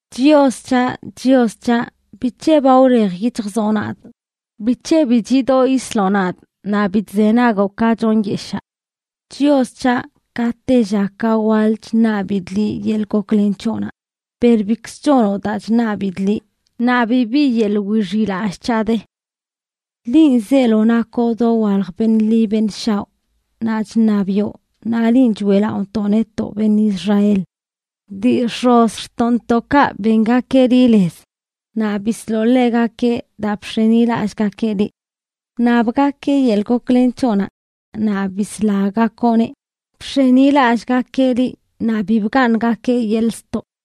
Chios c̱haꞌ, Chios c̱haꞌ, ¿bic̱he ba wlej yic̱hjzoꞌ nadꞌ? ¿bic̱he bi chidoꞌ yisloꞌ nadꞌ, ni bi chzenagoꞌ ka chonyeshaa? Chios c̱haꞌ, ka tella ka waḻ chṉabidꞌ liꞌ yeḻꞌ goklen c̱hoꞌnaꞌ, per bikzə chonoꞌ daa chṉabidꞌ liꞌ, naꞌ bibi yeḻꞌ wixiꞌlallꞌ c̱haꞌ de. Linꞌ zeelo nakoꞌ dowalj beṉꞌ ḻi beṉꞌ shaoꞌ, naꞌ chṉabiꞌo, naꞌ linꞌ choeꞌlaꞌontoꞌ netoꞌ beṉꞌ Israel. Dii x̱ozꞌxtoꞌntoꞌkaꞌ bengakeꞌ liꞌ lez, naꞌ bisloꞌ ḻegakeꞌ daa bx̱enilallꞌgakeꞌ liꞌ. Wṉabgakeꞌ yeḻꞌ goklen c̱hoꞌnaꞌ, naꞌ bislagakoꞌneꞌ; bx̱enilallꞌgakeꞌ liꞌ, naꞌ bi bgaaṉgakeꞌ yeḻꞌ ztoꞌ.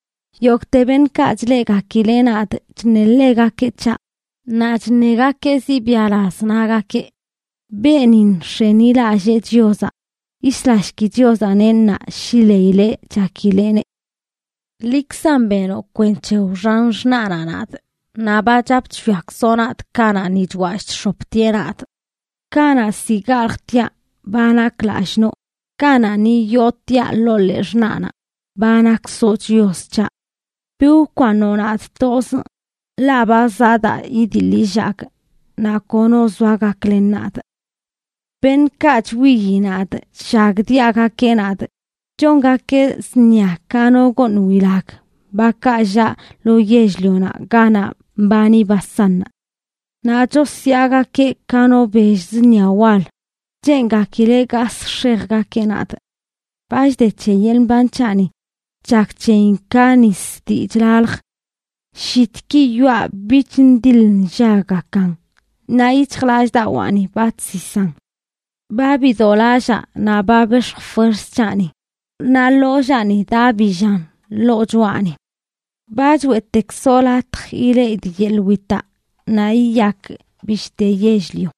Yogꞌte beṉꞌkaꞌ chleꞌgakileꞌ nadꞌ chṉeḻegakeꞌ c̱haꞌ, naꞌ chṉegakeꞌ zibiaꞌlaz, nagakeꞌ: “Beenin nx̱enilallee Chiozaꞌ; yislashki Chiozaꞌneꞌ ṉaa shi leileꞌ chakileꞌneꞌ.” Liꞌkzan benoꞌ kwenc̱he wxan xṉaꞌnaꞌ nadꞌ; naꞌ ba chap chwiakzoꞌ nadꞌ kanaꞌ ni chwallꞌ chx̱optieꞌ nadꞌ. Kanaꞌ ziꞌ galjtiaꞌ, ba nakꞌ lallꞌ noo; kanaꞌ ni yootiaꞌ ḻoo ḻee xṉaꞌnaꞌ, ba nakkzoꞌ Chios c̱haꞌ. Bi wkwaaṉoꞌ nadꞌ tozꞌ, ḻaꞌ ba zaꞌ daa idiḻ illagꞌ, naꞌ kono zoa gaklen nadꞌ. Beṉꞌkaꞌ chwiyi nadꞌ llagdiaꞌgakeꞌ nadꞌ chongakeꞌ zṉia ka no gooṉ wilag, bakaꞌ llaꞌ lo yell-lionaꞌ ganaꞌ mbani Basánnaꞌ. Naꞌ chosyaagakeꞌ ka no bell zṉia wal, cheengakileꞌ gasꞌ x̱ejgakeꞌ nadꞌ. Ba chde c̱he yeḻꞌ mban c̱haꞌni, chak c̱heyin ka nis dii chlalj. Llitki yoꞌa bich ndiḻ nllaggakan, naꞌ yic̱hjlallꞌdawaani ba chsisan. Ba bidolallaa naꞌ ba bex̱j fuerz c̱haꞌni, naꞌ ḻollaani daꞌbillan ḻoo choꞌani. Ba choeꞌtekzoꞌ latj ileꞌidꞌ yeḻꞌ witaꞌ naꞌ yiyakꞌ bishte yell-lio.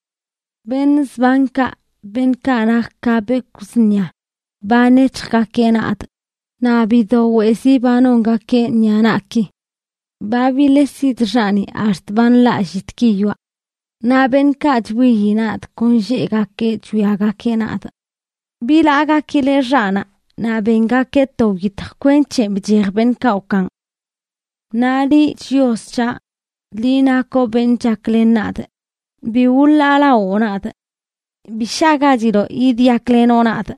Beṉꞌ zbankaꞌ, beṉꞌkaꞌ nak ka bekwꞌ zṉia, ba nec̱hjgakeꞌ nadꞌ, naꞌ bido weꞌzi ba nongakeꞌ ṉiꞌa naꞌki. Ba biles yidxaꞌni ax̱t ba nḻaꞌ llitki yoꞌa. Naꞌ beṉꞌkaꞌ chwiyi nadꞌ kon lleꞌgakeꞌ chwiagakeꞌ nadꞌ. Bilaagakileꞌ xaꞌnaꞌ, naꞌ bengakeꞌ to wyitj kwenc̱he bchej beṉꞌkaꞌ wkaan. Naꞌ liꞌ, Chios c̱haꞌ, liꞌ nakoꞌ beṉꞌ chaklen nadꞌ, ¡bi wḻaalawoo nadꞌ! ¡Bi shagachiloꞌ yidyaklenoꞌ nadꞌ!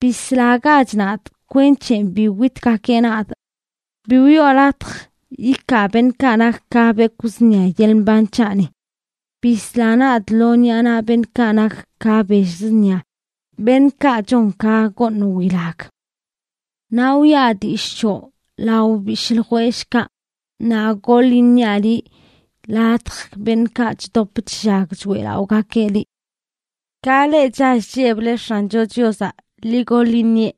Bislagach nadꞌ kwenc̱he bi witgakeꞌ nadꞌ; bi wiꞌo latj yikaa beṉꞌkaꞌ nak ka bekwꞌ zṉia yeḻꞌ mban c̱haꞌni. Bisla nadꞌ lo ṉiꞌa naꞌ beṉꞌkaꞌ nak ka bell zṉia, beṉꞌkaꞌ chon ka gooṉ wilag. Naꞌ wiꞌa dillꞌ c̱hoꞌ lao bishꞌ ljwellꞌkaꞌ, naꞌ goḻ iṉiaꞌ liꞌ ladj beṉꞌkaꞌ chdop chllag choeꞌlaꞌogakeꞌ liꞌ. Ka leꞌ chall chlleble X̱ancho Chiozaꞌ, ¡ḻi goḻ iṉieꞌ!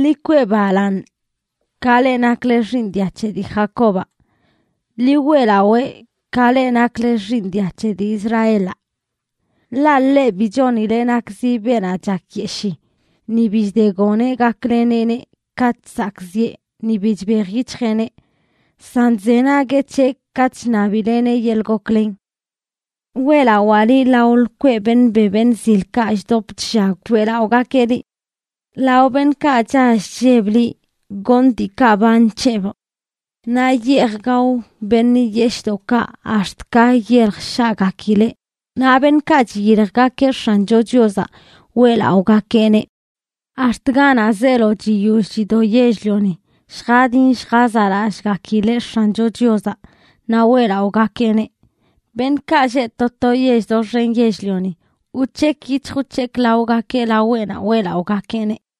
¡Ḻi kwee balaaṉ, ka leꞌ nakle xiiṉ dia c̱he dii Jacobaꞌ! ¡Ḻi weꞌlawee, ka leꞌ nakle xiiṉ dia c̱he dii Israelaꞌ! Ḻaꞌ ḻeꞌ bi chonileꞌ nakzi beenaꞌ chakyeshii, ni bi chdegoneꞌ gakleneꞌneꞌ katꞌ chzakꞌziꞌe, ni bi chbej yic̱hjeꞌneꞌ. San chzenagueꞌ c̱heꞌ katꞌ chṉabileꞌneꞌ yeḻꞌ goklen. Weꞌlawaa liꞌ lao lkweꞌ beṉꞌ be beṉꞌ zilkaꞌ chdop chllag choeꞌlaꞌogakeꞌ liꞌ. Lao beṉꞌkaꞌ chall chlleb liꞌ goṉꞌ diikaꞌ ba nc̱hebꞌ. Naꞌ yeej gao beṉꞌ yeshꞌdoꞌkaꞌ ax̱t ka yelj shaꞌgakileꞌ; naꞌ beṉꞌkaꞌ chiyiljgakeꞌ X̱ancho Chiozaꞌ, weꞌlaꞌogakeꞌneꞌ. Ax̱t ganaꞌ zeelo chiyoll chido yell-lioni lljadin lljazaꞌlallꞌgakileꞌ X̱ancho Chiozaꞌ, naꞌ weꞌlaꞌogakeꞌneꞌ. Beṉꞌkaꞌ lleꞌ to to yell doxen yell-lioni wc̱hekꞌ yic̱hj wc̱hekꞌ laogakeꞌ laweꞌnaꞌ weꞌlaꞌogakeꞌneꞌ.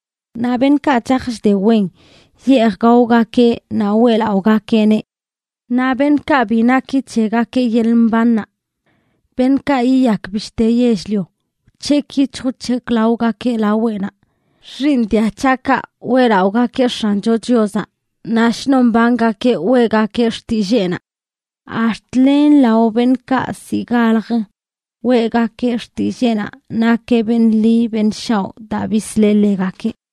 Naꞌ beṉꞌkaꞌ chaj chde wen, yeej gaogakeꞌ naꞌ weꞌlaꞌogakeꞌneꞌ. Naꞌ beṉꞌkaꞌ bi naki c̱hegakeꞌ yeḻꞌ mbannaꞌ, beṉꞌkaꞌ yiyak bishte yell-lio, wc̱hekꞌ yic̱hj wc̱hekꞌ laogakeꞌ laweꞌnaꞌ. Xiiṉ dia c̱haꞌkaꞌ weꞌlaꞌogakeꞌ X̱ancho Chiozaꞌ; naꞌ shnon mbangakeꞌ weꞌgakeꞌ xtilleenaꞌ. Ax̱t len lao beṉꞌkaꞌ ziꞌ galjə, weꞌgakeꞌ xtilleenaꞌ nakeꞌ beṉꞌ ḻi beṉꞌ shaoꞌ daa bisleꞌ ḻegakeꞌ.